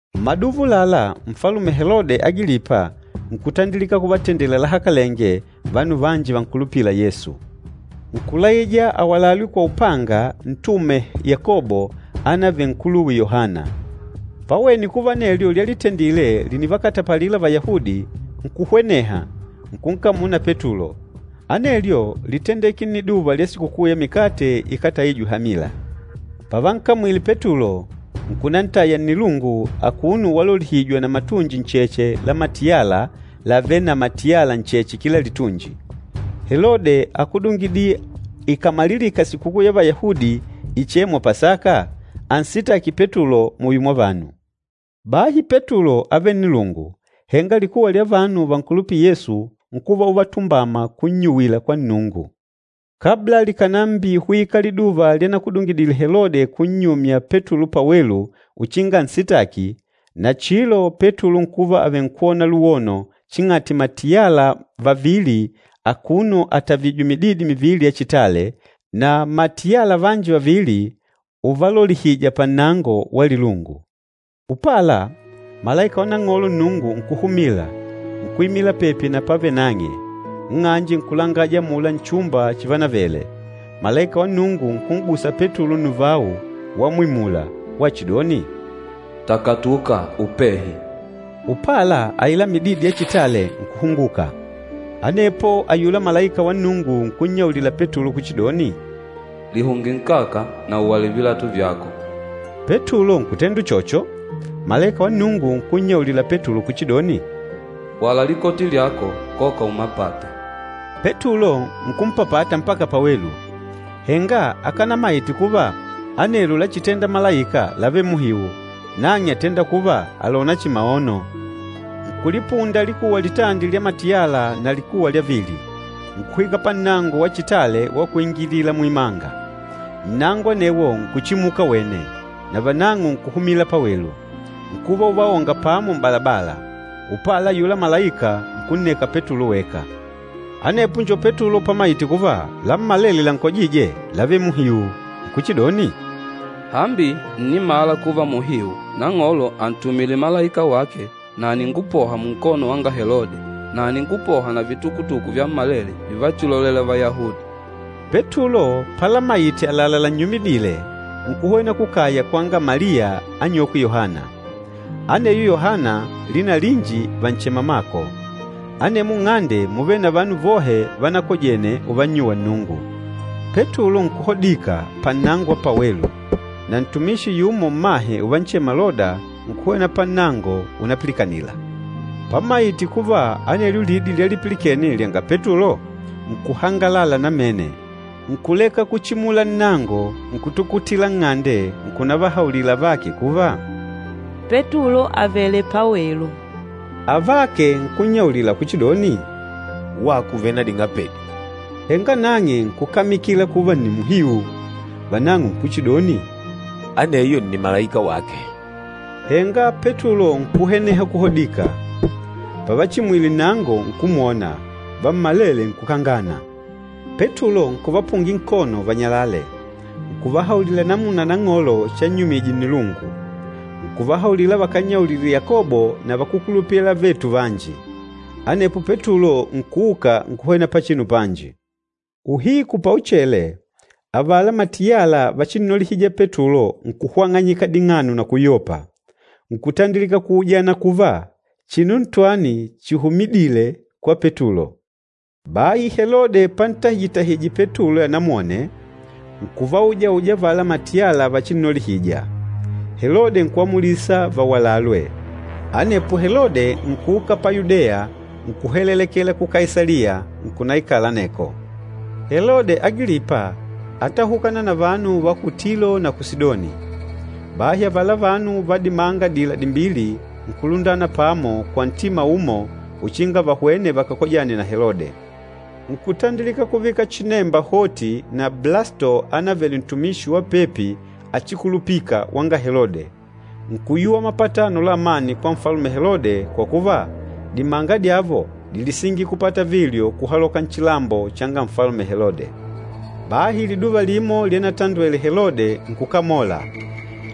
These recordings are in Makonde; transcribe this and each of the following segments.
Mmaduva ulala, Nfalume Helode Agilipa nkutandilika kuvatendela lahakalenge vanu vanji vankulupîla Yesu. Nkulaija awalalwe kwa upanga Ntume Yakobo anavele nkuluwe Yohana. Pawene kuva anelyo lyalitendile lìnivakatapalila Vayahudi, nkuhweneha, nkunkamula na Petulo. Anelyo lítendeke nniduva lya Sikukuu ya Mikate Ikátaijwe Hamila. Pavankamwile Petulo, nkunantaya nnilungu akuno walolihijwa na matunji ncheche la matiyala lavêle na matiyala ncheche kila litunji. Helode ákudungidile ikàmalilika sikukuu ya Vayahudi ichêmwa Pasaka, ansitaki Petulo muyo mwa vanu. Bahi Petulo ávele nnilungu, henga likuwa lya vanu vankulupîla Yesu nkuva uvatumbama kunnyuwila kwa Nnungu. Kabla likànambihwika liduva lyanakudungidile Helode kunnyumya Petulo pawelu uchinga ansitaki, nachilo Petulo nkuva avenkwona luwono ching'ati matiyala vavili akuno atavìjwè mididi mivili ya chitale, na matiyala vanji vavili uvalolihija pannango wa lilungu. Upala, malaika wa Nang'olo Nnungu nkuhumila, nkuimila pepi na pavêle nang'e, nng'anje nkulangaja amula nchumba chivanavele. Malaika wa Nnungu nkun'gusa Petulo nnuvau wamwimula, wachidoni, “Takatuka upehi!” Upala aila mididi ya chitale nkuhunguka. Anepo ayula malaika wa Nnungu nkunnyaulila Petulo kuchidoni, “Lihunge nkaka na uwale vilatu vyako.” Petulo nkutenda uchocho. Malaika wa Nnungu nkunnyaulila Petulo kuchidoni, “Wala likoti lyako, koka umapate.” Petulo nkumpapata mpaka pawelu, henga akanamaite kuva anelo lachitenda malaika lávele muhiu, nang'e átenda kuva àlona chihi maono. Nkulipunda likuwa litandi lya matiyala na likuwa lya vili, nkuhwika pannango wa chitale wa kuingilila muimanga. Nnango anewo nkuchimuka wene, navanang'o nkuhumila pawelu. Nkuva uvaonga pamo m'balabala, upala ayula malaika nkunneka Petulo weka. Anepo njo Petulo pamaite kuva lammalele lankojîje lávele muhiu, nkuchidoni, “Hambi ǹnimala kuva muhiu Nang'olo ántumile malaika wake na àningupoha munkono wanga Helode na àningupoha na vitukutuku vyammalele vivachilolela Vayahudi.” Petulo palamayite àlalá lannyumidile, nkuhwena kukaya kwanga Maliya anyokwe Yohana. Aneyo Yohana lina linji vànchema Mako. Anemwo nng'ande múvele na vanu vohe vanakojene uvannyuwa Nnungu. Petulo nkuhodika pannango wa pawelu, na ntumishi yumo mmahe uvanchema Loda, nkuhwena pannango unapilikanila. Pamaite kuva anelyo lidi lyalipilikene lyanga Petulo, nkuhangalala namene, nkuleka kuchimula nnango nkutukutila nng'ande nkunavahaulila avake kuva, “Petulo àvele pawelu.” Avake nkunnyaulila kuchidoni, “Wako ùvele na ding'apedi!” Henga nang'e nkukamikila kuva nni muhiu. Vanang'o nkuchidoni, “Aneyo nni malaika wake.” Henga Petulo nkuhweneha kuhodika. Pavachimwile nnango, nkumwona, vammalele nkukangana. Petulo nkuvapungila nkono vanyalale, nkuvahaulila namuna Nang'olo channyumije nnilungu. Nkuvahaulila vakannyaulile Yakobo na vakúkulupila avetu vanji. Anepo Petulo nkuuka nkuhwena pachinu panji. Uhiku pauchele, avala matiyala vachinnolihija Petulo nkuhwang'anyika ding'ano na kuyopa, nkutandilika kuujana kuva, chinu ntwani chihumidîle kwa Petulo. Bahi Helode pantahije-tahije Petulo anamwone, nkuvaujauja avala matiyala vachinnolihija, Helode nkuamulisa vawalalwe. Anepo Helode nkuuka pa Yudeya nkuhelelekela ku Kaisaliya, nkunaikala aneko. Helode Agilipa átahukana na vanu va ku Tilo na ku Sidoni. Bahi avala vanu va dimanga adila dimbili nkulundana pamo kwa ntima umo uchinga vahwene vakakojane na Helode. Nkutandilika kuvika chinemba hoti na Blasto anavele ntumishi wa pepi achikulupika wanga Helode. Nkuyuwa mapatano la amani kwa Nfalume Helode kwa kuva, dimanga dyavo dílisingila kupata vilyo kuhaloka nchilambo changa Nfalume Helode. Bahi liduva limo lyanatandwele Helode nkukamola,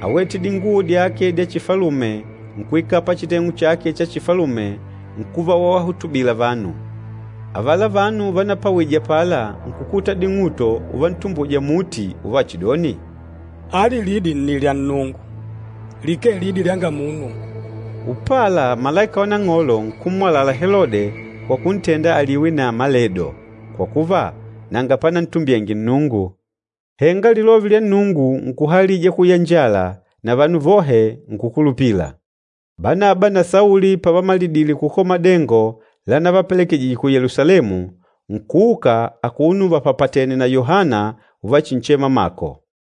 áwete dinguo dyake dya chifalume nkuikala pachiteng'u chake cha chifalume nkuva wavahutubila vanu. Avala vanu vanapawije apala nkukuta ding'uto uvantumbuja muti uvachidoni, “Ali lidi nni lya nnungu, likee lidi lyanga munu.” Upala malaika wa Nang'olo nkummwalala Helode kwa kuntenda aliwe na maledo kwa kuva, nanga panantumbyenge Nnungu. Henga Lilove lya Nnungu nkuhalija kuyanjala na vanu vohe nkùkulupila. Banaba na Sauli pavamalidile kukola madengo lanavapelekejije ku Yelusalemu, nkuuka akuno vapapatènè na Yohana uvachinchema Mako.